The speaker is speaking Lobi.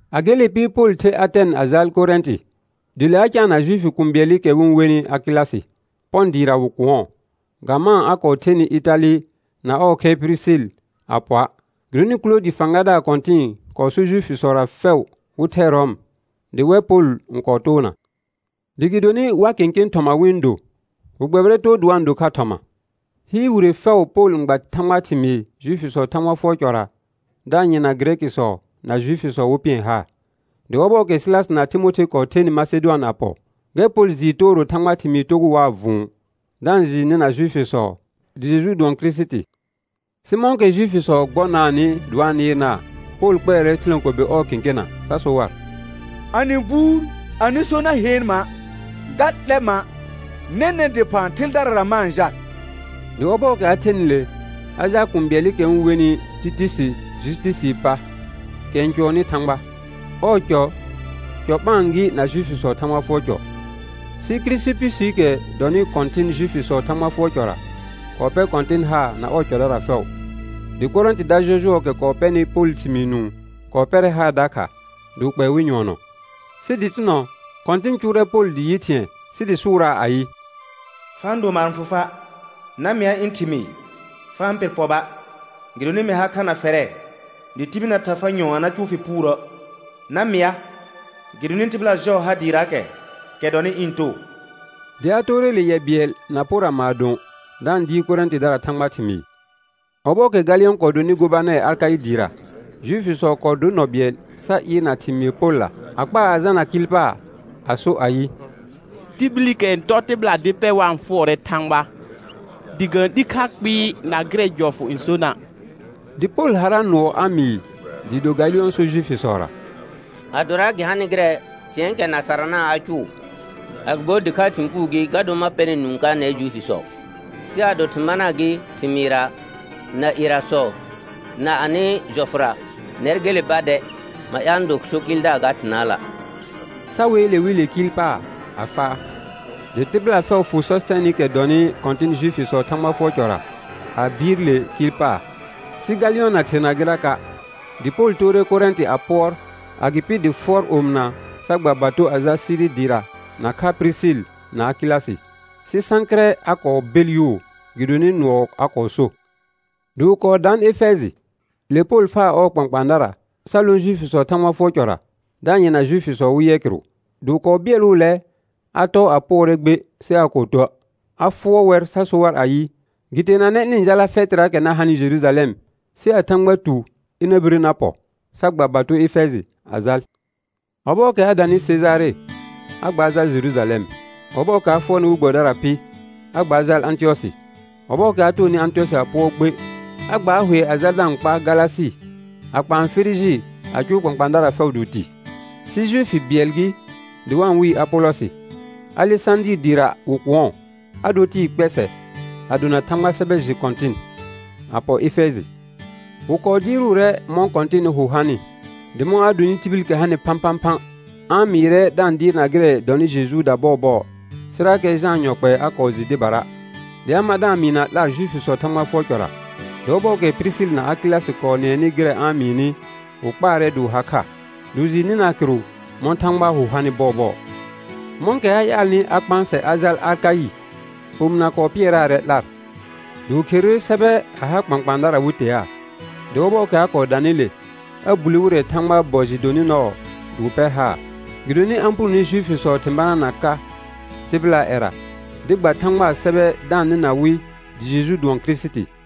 A gele pɩ, Pol ther Atɛn a jal Korɛ̃tɩ. Dɩ le a caana Juifi kũu bɩɛlɩkɛ wɩ-n wenɩ Akɩlasɩ; Pɔ̃ dɩɩra wɩ kʋ̃ɔ. Ga maan a kɔɔ thenɩ Ɩtalɩ na ɔɔ khɛr Pirisil a pɔa', gɩdonɩ Kʋloodɩ fãgadaar kɔ̃tɩ̃ɩ kɔɔ sor Juifisɔra fɛʋ wɩ thɛ Rɔm. Dɩ wɛr Pol n kɔɔ toona. Dɩ gɩdonɩ wa kẽkẽ thɔma wɩ-n do, wɩ gbɛbɩrɛ too dɩ wa-n do kha thɔma. Hɩɩr wire fɛʋ Pol n gba Thãgbaa thɩmɩɩ Juifisɔɔ Thãgba fʋɔr cɔra da-n yɩrna Gɩrɛkɩsɔ na Juifisɔ wɩ pɩɛr haar. Dɩ ɔhɔɔkɛ Sɩlasɩ na Timothe kɔɔ thenɩ Masedʋan a pɔ, gɛr Pol jɩɩ tooro Thãgbaa thɩmɩɩ togʋʋ waa vʋ̃ʋ, da-n jɩɩ nɩna Juifisɔ dɩ Jeju dʋɔn Kirisiti. Sɩ mɔ̃kɛ Juifisɔ gbɔnaanɩ dɩ wa-n nɩɩrnaa, Pol kpɛɛrɛ thɩlãkobe ɔɔ kẽkena sa so war: A nɩ buur, anɩ so na heen ma', ga 'lɛ ma'. Nɛnɛ̃ dɩphã thɩldarara ma-n jal. Dɩ ɔbɔɔkɛ a thenɩ le a jaal kũu bɩɛlɩkɛ wɩ-n wenɩ Tɩtusi Jusitusii pa, kɛ n cʋɔnnɩ Thãgba. Ɔɔ cɔ, cɔ ɓãa gɩ na Juifisɔɔ Thãgba fʋɔr cɔ. Sɩ Kirisipusiikɛ dɔnɩ kɔ̃tɩn Juifisɔɔ Thãgba fʋɔr cɔra kɔɔ pɛr Kɔ̃tɩn haar na ɔɔ cɔdara fɛʋ. Dɩ Korɛ̃tɩda jɔjʋɔɔkɛ kɔɔ pɛnɩ Polɩ thɩmɩɩ nũu kɔɔ pɛrɛ haar dakha dɩ wɩ kpɛɛ wɩ nyʋɔnɔ. Sɩ dɩtɩnɔ, Kɔ̃tɩn cʋʋrɛ Pol dɩ yɩ thɩ̃ɛ sɩ dɩ sʋʋraa ayɩ: Fa-n do maar n fʋ fa'. Na mɩa ɩ̃ thɩmɩɩ, fa-n pɩr pɔba', gɩdonɩ mɩ ha kha na fɛrɛ, dɩ tibil na tha far nyɔ̃ɔ a na cʋʋ fɩ puurə'; na mɩa gɩdonɩ tɩbɩla jɔɔ har dɩɩraakɛ, kɛ dɔnɩ ɩ̃ too. Dɩ a toore le yɛ bɩɛl na pora maadõ, da-n dɩɩr Korɛ̃tɩdara Thãgbaa thɩmɩɩ. Ɔbɔɔkɛ Galɩyɔ̃ kɔɔ donɩ gobanɛr Akaɩ dɩɩra, Juifisɔ kɔɔ dor nɔ bɩɛl sa ɩɩrna thɩmɩɩr Polla, a kpaa a jalna kɩɩl paar a so ayɩ: Tibilikɛ n tɔr tɩbɩla dɩ pɛr wa-n fʋɔrɛ Thãgba, dɩ ga-n 'li kha kpɩɩ na gɩrɛ jɔfʋ n sona'. Dɩ Pol harra nʋɔ a mɩɩ dɩɩ do Galɩyɔ̃ sor Juifisɔra: Adora gɩ hanɩ gɩrɛ thɩ̃ɛɛkɛ na sarana' a cʋʋ, agɩbo dɩkhaa thɩ̃ puu gɩ ga dor, ma pɛ nɛr nũu ka nɛr Juifisɔ; sɩ ado thɩ̃ banaa gɩ thɩmɩɩrra, na ierasɔ, na anɩ jɔfʋra, nɛr gele ba dɛ; ma ƴaal ɩ̃ do so kɩɩldaar ga thɩnaala'; sa weele wɩ le kɩɩl paar a faa. Dɩ tɩbɩla fɛʋ fʋ Sɔsɩtɛnɩkɛ dɔnɩ kɔ̃tɩn Juifisɔɔ Thãgba fʋɔr cɔra a bɩɩr le kɩɩl paar, sɩ Galɩyɔ̃ na therna gɩraka'. Dɩ Pol toore Korɛ̃tɩ a pʋɔr; agɩpɩ dɩ fʋɔr omɩna sa gba bato a jal Siri dɩɩra nakha Pirisil na Akɩlasɩ. Sɩ Sãkɩrɛ a kɔɔ bel yʋʋ gɩdonɩ nʋɔ a kɔɔ so. Dɩ wɩ kɔɔ daan Efɛjɩ; le Pol faa ɔɔ kpãkpãadara sa lõ Juifisɔɔ Thãgba fʋɔr cɔra da-n yɩrna Juifisɔ wɩ yɛ kɩrʋ; dɩ wɩ kɔɔ bɩɛlʋʋlɛ a tɔɔ a pʋɔrɛ gbe sɩ aa kɔɔ tuə', a fʋɔr wɛr sa so ayɩ, gɩ teenanɛ ɩnɩ-n jala fɛtɩraakɛ na hanɩ Jerujalɛm sɩ a Thãgba tu ɩna bire na pɔ; sa gba bato Efɛjɩ a jal. Ɔbɔɔkɛ a danɩ Sejare, a gbaar jal Jerujalɛm. Dɩ ɔbɔɔkɛ a fʋɔrnɩ we gbɛbɩdara pɩ, a gbaar jal Ãtɩyɔsɩ. Ɔbɔɔkɛ a toonɩ Ãtɩyɔsɩ a pʋɔr gbe, a gbaar hʋɛ a jal da-n kpaar Galasɩ a kpaan Firiji a cʋʋ kpãkpãadara fɛʋ dɩ wɩ tɩ. Sɩ Juifi bɩɛl gɩ dɩ wa-n wɩɩ Apolɔsɩ, Alesãdɩɩr dɩɩra wɩ kʋ̃ɔ; a dor tɩɩ kpɛsɛɛ a dona Thãgbaa sɛbɛ jɩ kɔ̃tɩn, a pɔ Efɛjɩ. Wɩ kɔɔ dɩɩrʋʋrɛ mɔ̃ Kɔ̃tɩnɩ hʋ hanɩ, dɩ mɔ̃ a donɩ tibilikɛ hanɩ phãphãphã, a-n mɩɩrɛ da-n dɩɩrna gɩrɛ dɔnɩ Jejuuda bɔɔbɔɔ; sɩrakɛ Jãa yɔ kpɛɛ a kɔɔ jɩ dɩbara. Dɩ a mar da-n mɩɩ na 'lar Juifisɔɔ Thãgba fʋɔr cɔra. Dɩ ɔbɔɔkɛ Pirisil na Akɩlasɩ kɔɔ nɩɛnɩ gɩrɛ a-n mɩɩnɩ, wɩ kpaarɛ dɩ wɩ ha kha, dɩ wɩ jɩɩ nɩnaa kɩrʋ mɔ̃ Thãgbaa hʋ hanɩ bɔɔbɔɔ. Mɔ̃kɛ a ƴaalnɩ a kpãasɛ a jal Akaɩ, omɩna kɔɔ pɩɛraarɛ 'lar. Dɩ wɩ kherere sɛbɛ a ha kpãkpãadara wɩ teaa. Dɩ ɔbɔɔkɛ a kɔɔ danɩ le, a bulle wɩrɛ Thãgbaa bɔ jɩ donɩ nɔɔ dɩ wɩ pɛr haar; gɩdonɩ a-n punone Juifisɔ thɩ̃ banaana ka tɩbɩlaa ƴɛra, dɩ gba Thãgbaa sɛbɛ da-n nɩna wɩ dɩ Jeju dʋɔn Kirisiti.